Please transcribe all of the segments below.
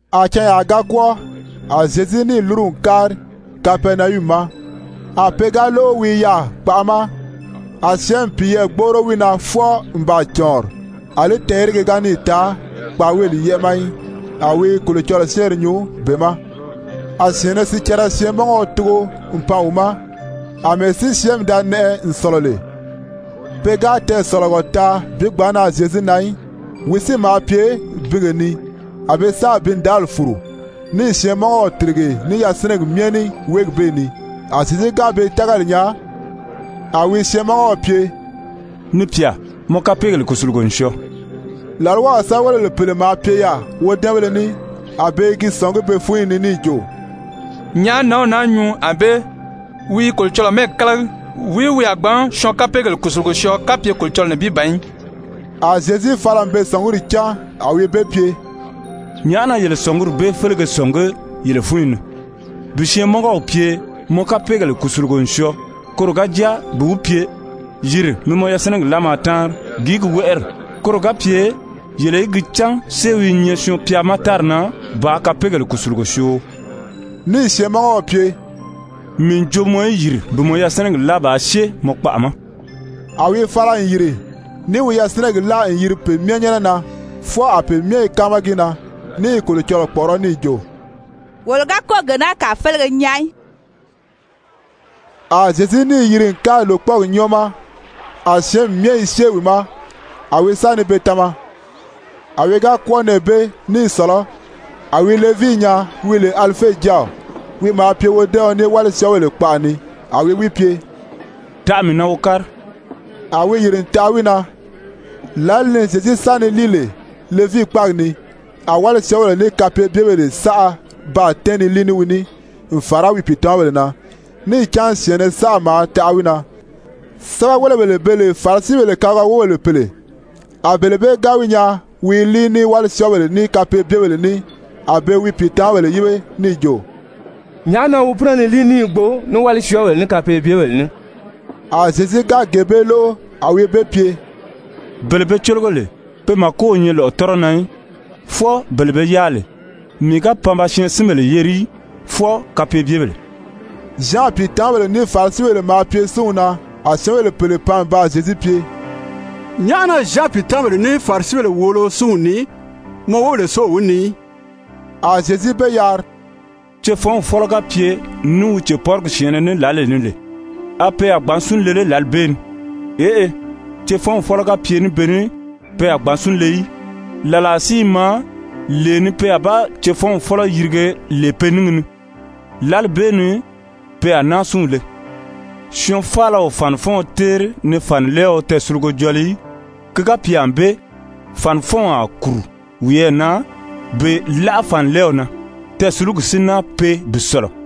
A canyaa ga kwɔ́ɔ, a Zyezu níì lúru n kári Kapɛrinayumi ma. A pe ga lóʔo wi i yaà kpaʔa ma, a syɛ́ɛnmi piyɛɛ gbóʔoro wi na fwɔɔ n baa cɔ̀ɔnri. Alí tɛɛ̀yérege ga níì taa kpaaweeli yɛ́ʔɛ ma í. A wi i Kolocɔlɔɔ syɛ́ɛnri nyuu be ma. A syɛ̀ɛnnɛ sicɛrɛ syɛɛnmɔngɔɔ tugo n pan wi ma. Amɛɛ si syɛ́ɛnmi da nɛʔɛ n sɔ̀lɔ lè, pe ga tɛɛsɔ̀lɔgɔ taa bi gbǎn nan Zyezu na í. Wi si maa pye binge ni. A be sáà bindàáli fùru, níì syɛɛnmɔngɔw tìrige ní yasinɛgi myɛ ní wéegi bee ni. A Zyezu ga be tágali nyaa, a wi syɛɛnmɔngɔw pye: «Ni pyà, mɔ kapeegèle kùsulugo n syɔɔ.» Làlwaw sɛ́bɛwelebèle pèle maa pye yaà wodɛ́ɛnbéle ní, a be i gi sɔ̀ngí be fúnyi ni níì jo: «Nyàʔá nǎnw naa nyuu ànbée? Wi i Kolocɔlɔɔ mɛ́ɛgi kálagi. Wìí wi a gbǎn syɔɔn kapeegèle kùsulugo syɔɔ kapye Kolocɔlɔɔ nibin ban í?» A Zyezu fala n be sɔ̀nguri cán, a wi be pye: «Nyàʔá na yele sɔ̀nguri bee félege sɔ̀ngí yele fúnyi ni? Bi syɛɛnmɔngɔw pye: ‹Mɔ kapeegèle kùsulugo n syɔɔ,› koro ga jáa bi wi pye: ‹Yìri mi mɔ yasinɛgi láa maa táanri,› gìí gi wɛ́ʔɛri? Koro ga pye yele í gi cán séew i nyɛ Syɔɔn-pya ma tári na bàā kapeegèle kùsulugo syoo.» Níì syɛɛnmɔngɔw pye: «Mii n jo mɔ í yìri bi mɔ yasinɛgi láa bàā syée mɔ kpaʔa ma.» A wi fala n yìri níì wi yasinɛgi láa n yiri pe myɛ nyɛ́nɛ na, fwɔɔ a pe myɛ i káama gi na, ní i Kolocɔlɔɔ kpɔ̀ʔɔrɔ́ níì jo: «Wolo ga kɔ́ɔ̀ gee naa kàa félege nyaa í.» A Zyezu níì yiri n kári lòkpɔɔgi nyɔ́ɔ ma, a syɛ́ɛnmi myɛ i syée wi ma, a wi sa ni be tama. A wi ga kwɔ́ɔ nɛɛ bee ní i sɔ̀lɔ́, a wi Levii Levii: Pe wɔ́ɔ i Levii yiri Matye. nyaa wi lè Alife jáaw, wi maa pye wodɛ́ɛɔn ní wálisyɔɔbèle kpaʔa ni. A wi wi pye: «Taʔa mii na wo kári.» A wi yìri n taʔa wi na. Lǎli ni Zyezu sa ni líi lè Levii kpáagi ni, a wálisyɔɔbèle ní kapeebyebèle saʔa baa tɛ́ɛn ni líi ní wi ní n fàra wi pìitamabèle na, níì cán syɛ̀ɛnnɛ saʔa maa taʔa wi na. Sɛ́bɛwelebèle be lè Farisibèle kabiga wóbèle pèle, a bele bee ga wi nyaa wi i líi ní wálisyɔɔbèle, ní kapeebyebèle ní, a be wi pìitamabèle yíbe níì jo: «Nyàʔá na wi pínɛ ni líi ní i gbo ní wálisyɔɔbèle, ní kapeebyebèle ní?» A Zyezu ga gee bee lóʔo, a wi be pye: «Bele be cólogo lè, pe màko o nyɛ lɔ̀ʔɔtɔrɔ na í, fwɔɔ bele be yáa lè. Mii ga pan ba syɛɛnsinbèle yeri í, fwɔɔ kapeebyebèle.» Zyan pìitamabèle ní Farisibèle maa pye súnw na. A syɛ́ɛnbèle pèle pan n baa Zyezu pye: «Nyàʔá na Zyan pìitamabèle ní Farisibèle wòolo súnw nii, mɔ wóbèle si o wi nii í?» A Zyezu be yari: «Cefɔnw fɔ́lɔ ga pye ní wi cèpɔrigi syɛ̀ɛnnɛ ní lǎlee ni lè, a pe a gbǎn sún le lé lǎli bee ni? Eʔe, cefɔnw fɔ́lɔ ga pye ní be ní, pe a gbǎn sún le í. Làlaa si i maa lee ni pe a ba cefɔnw fɔ́lɔ yirige lè pe níngi ni, lǎli bee ni pe a náa súnw le. Syɔɔn faala o fànifɔɔn téeri ni fànilɛɛɔ tɛɛsulugo jɔli í. Ki ga pye ànbée, fànifɔnw a kùru wiyɛɛ na bi láʔa fànilɛɛw na, tɛɛsulugi si náa pee bi sɔ̀lɔ.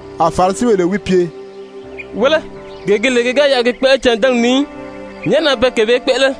A Farisibèle wi pye: «Wéle, gee gi lè ki ga yɛlɛ gi kpéʔele cândɛnɛgi ni í, nyàʔá na pe gee bee kpéʔele?»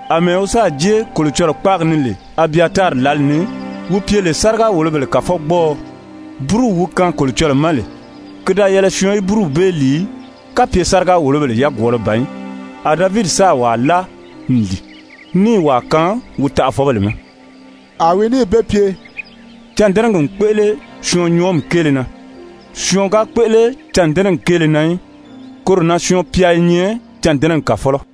Amɛɛ wi sáà jée Kolocɔlɔɔ kpáagi ni lè Abyatari lǎli ni, wi pye lè sáriga-wòlobèle kàfɔgbɔɔɔ, búruw wi kaan Kolocɔlɔɔ ma lè, ki da yɛlɛ syɔɔn í búruw bee lìi í, kapye sáriga-wòlobèle yagwɔɔlɔ ban í, a Davidi sáà wàa láa n lìi, níì wàa kaan wi taʔafɔbèle ma.» A wi níì be pye: «Cândɛnɛgi n kpéʔele syɔɔn nyɔɔmi kéele na, syɔɔn ga kpéʔele cândɛnɛgi kéele na í. Koro na Syɔɔn-pya i nyɛ cândɛnɛgi kàfɔlɔ.»